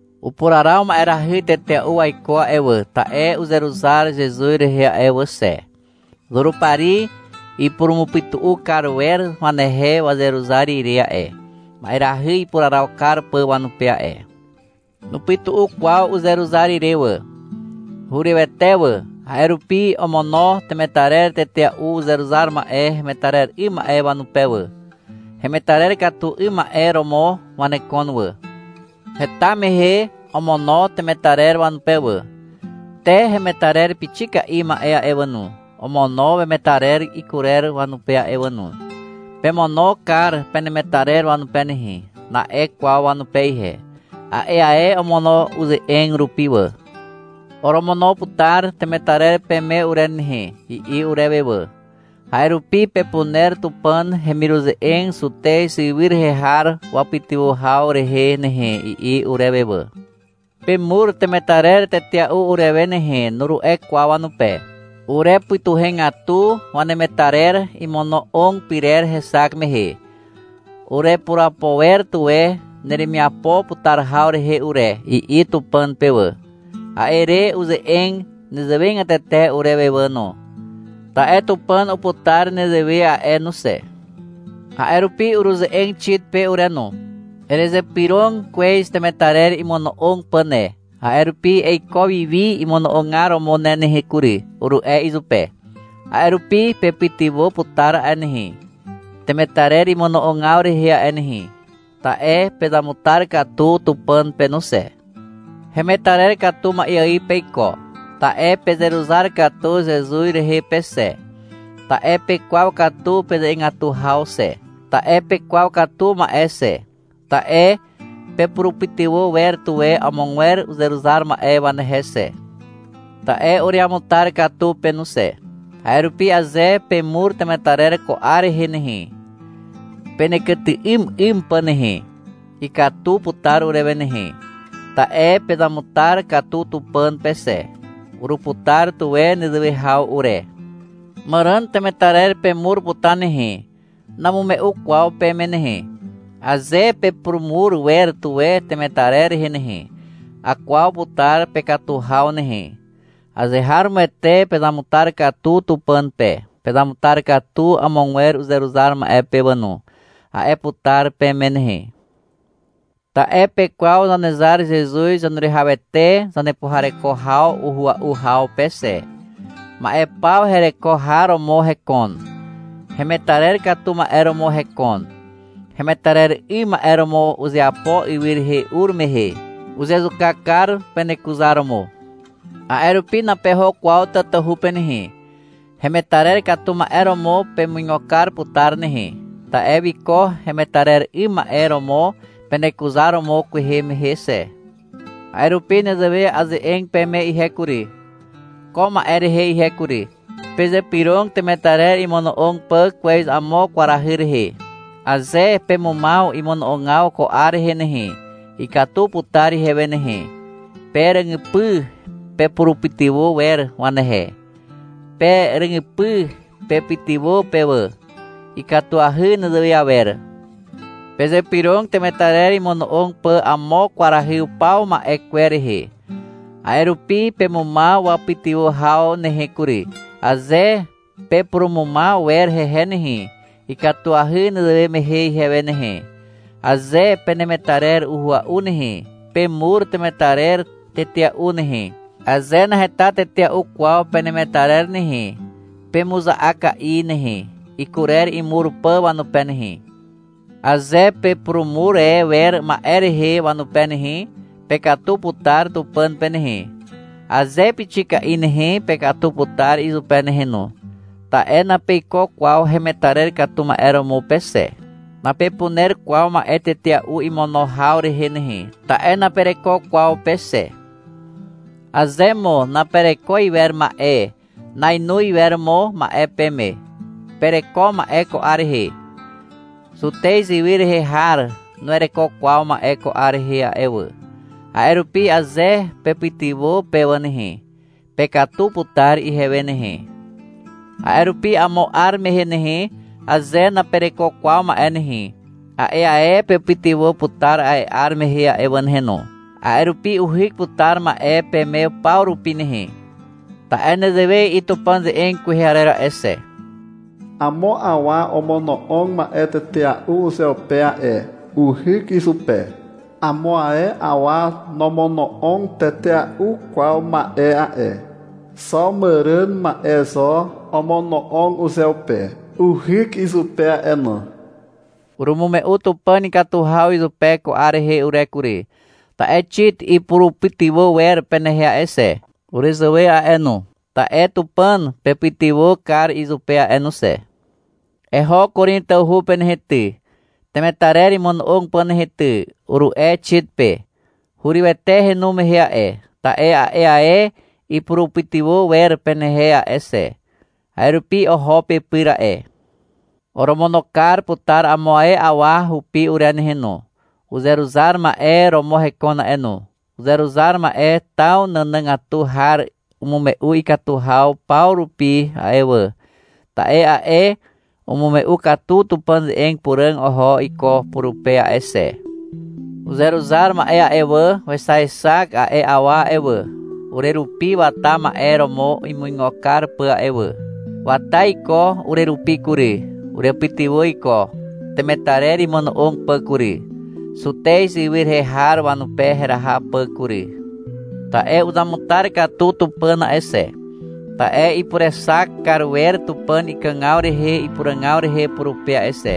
Upuraraw ma'erahy tetea'u waiko a'e wà, ta'e uzeruzar Zezuz rehe a'e wà xe. Zurupari ipurumupytu'u kar wer wanehe wazeruzar ire a'e, ma'erahy ipuraraw kar pà wanupe a'e. Nupytu'u kwaw uzeruzar ire wà. Hurywete wà. A'e rupi omono temetarer tetea'u uzeruzar ma'e hemetarer 'ym ma'e wanupe wà. Hemetarer katu 'ym ma'e romo wanekon wà. Heta mehe omono temetarer wanupe wà. Te hemetarer pixika'i ma'e a'e wà no, omono wemetarer ikurer wanupe a'e wà no. — Pemono kar penemetarer wanupe nehe, na'e kwaw wanupe ihe. A'e ae omono uze'eg rupi wà. — Oromono putar temetarer peme ure nehe, i'i urewe wà. — A'e rupi pepuner Tupàn hemiruze'eg Zutez ywy rehe har wapytywà haw rehe nehe, i'i urewe wà. — Pemur temetarer tetea'u urewe nehe, nuru'e kwaw wanupe. Urepytuhegatu wanemetarer imono'og pyrer hexak mehe. — Urepurapo wer tuwe neremiapo putar haw rehe ure, i'i Tupàn pe wà. A'e re uze'eg nezewegatete urewe a'e wà no. Ta'e Tupàn uputar nezewe a'e no xe. A'e rupi uruze'eg Xit pe ure no. — Erezypyrog kwez temetarer imono'og pà ne. A'e rupi eiko wiwi imono'ogar romo ne nehe kury, uru'e izupe. A'e rupi pepytywà putar a'e nehe, temetarer imono'ogaw rehe a'e nehe. Ta'e pezamutar katu Tupàn pe no xe. Hemetarer katu ma'e ài peiko, ta'e pezeruzar katu Zezuz rehe pe xe. Ta'e pekwaw katu peze'egatu haw xe. Ta'e pekwaw katu ma'e xe. Ta'e pepurupytywà wer tuwe amogwer uzeruzar ma'e wanehe xe. Ta'e ureamutar katu pe no xe. A'e rupi aze pemur temetarer ko 'ar rehe nehe, penekyty'ym 'ym pà nehe, ikatu putar urewe nehe. Ta'e pezamutar katu Tupàn pe xe. Uruputar tuwe nezewe haw ure. Màràn temetarer pemur putar nehe. Namume'u kwaw peme nehe. Aze pepurumur wer tuwe temetarer rehe nehe, akwaw putar pekatu haw nehe. — Azeharomoete pezamutar katu Tupàn pe, pezamutar katu amogwer uzeruzar ma'e pe wà no, a'e putar peme nehe. Ta'e pekwaw Zanezar Zezuz Zaneruwihawete zanepuhareko haw uhua'u haw pe xe. Ma'e paw hereko har romo hekon. Hemetarer katu ma'e romo hekon. Hemetarer 'ym ma'e romo uzeapo ywy rehe ur mehe. Uzezuka kar penekuzaromo. A'e rupi napeho kwaw tatahu pe nehe. Hemetarer katu ma'e romo pemuigo kar putar nehe, ta'e wiko hemetarer 'ym ma'e romo penekuzar romo kwehe mehe xe. A'e rupi nezewe aze'eg peme ihe kury, ko ma'e rehe ihe kury. Pezypyrog temetarer imono'og pà kwez amo kwarahy rehe. Aze pemumaw imono'ogaw ko 'ar rehe nehe, ikatu putar ihewe nehe. Pe ràgypy pepurupytywà wer wanehe. Pe ràgypy pepytywà pe wà. Ikatuahy nezewe awer. Pezypyrog temetarer imono'og pà amo kwarahy upaw ma'e kwer rehe. A'e rupi pemumaw wapytywà haw nehe kury. Aze pepurumumaw wer hehe nehe, ikatuahy nezewe mehe ihewe nehe. Aze penemetarer uhua'u nehe, pemur temetarer tetea'u nehe. Aze naheta tetea'u kwaw penemetarer nehe, pemuza'aka'i nehe, ikurer imur pà wanupe nehe. Aze pepurumur e wer ma'e rehe wanupe nehe, pekatu putar Tupàn pe nehe. Aze pixika'i nehe, pekatu putar izupe nehe no, ta'e napeiko kwaw hemetarer katu ma'e romo pe xe. Napepuner kwaw ma'e tetea'u imono haw rehe nehe, ta'e napereko kwaw pe xe. Aze mo napereko iwer ma'e, nainoz iwer mo ma'e peme. Pereko ma'e ko 'ar rehe. Zutez ywy rehe har nuwereko kwaw ma'e ko 'ar rehe a'e wà. A'e rupi aze pepytywà pe wà nehe, pekatu putar ihewe nehe. A'e rupi amo 'ar mehe nehe, aze napereko kwaw ma'e nehe, a'e ae pepytywà putar a'e 'ar mehe a'e wà nehe no. A'e rupi uhyk putar ma'e peme paw rupi nehe. Ta'e nezewe i'i Tupàn ze'eg kwehe arer a'e xe. — Amo awa omono'og ma'e tetea'u uzeupe a'e. Uhyk izupe. Amo ae awa nomono'og tetea'u kwaw ma'e a'e. Xo màràn ma'e zo omono'og uzeupe. Uhyk izupe a'e no. Urumume'u Tupàn ikatu haw izupe ko 'ar rehe ure kury, ta'e Xit ipurupytywà wer penehe a'e xe, urezàwe a'e no. Ta'e Tupàn pepytywà kar izupe a'e no xe. — Eho Korin tawhu pe nehe ty, temetarer imono'og pà nehe ty, uru'e Xit pe. Hurywete henu mehe a'e, ta'e a'e ae ipurupytywà wer penehe a'e xe. A'e rupi oho pepyr a'e. Oromono kar putar amo ae awa hupi ure nehe no. Uzeruzar ma'e romo hekon a'e no. Uzeruzar ma'e taw nànàgatu har umume'u ikatu haw paw rupi a'e wà, ta'e a'e umume'u katu Tupàn ze'eg puràg oho iko purupe a'e xe. Uzeruzar ma'e a'e wà, wexaexak a'e awa a'e wà, urerupi wata ma'e romo imuigo kar pà a'e wà. Wata iko urerupi kury, urepytywà iko temetarer imono'og pà kury, Zutez ywy rehe har wanupe heraha pà kury. Ta'e uzamutar katu Tupàn a'e xe, ta'e ipurexak kar wer Tupàn ikàgaw rehe ipuràgaw rehe purupe a'e xe,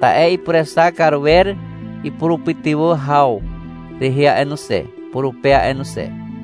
ta'e ipurexak kar wer ipurupytywà haw rehe a'e no xe, purupe a'e no xe.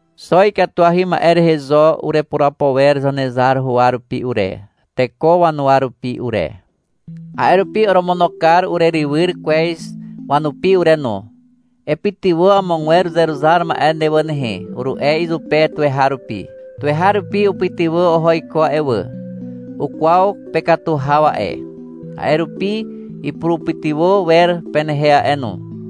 Xo ikatuahy ma'e rehe zo urepurapo wer Zanezar huwa rupi ure, teko wanuwa rupi ure. A'e rupi oromono kar urerywyr kwez wanupi ure no. — Epytywà amogwer uzeruzar ma'e ne wà nehe, uru'e izupe tuweharupi. Tuweharupi upytywà oho iko a'e wà. Ukwaw pekatu haw a'e. A'e rupi ipurupytywà wer penehe a'e no.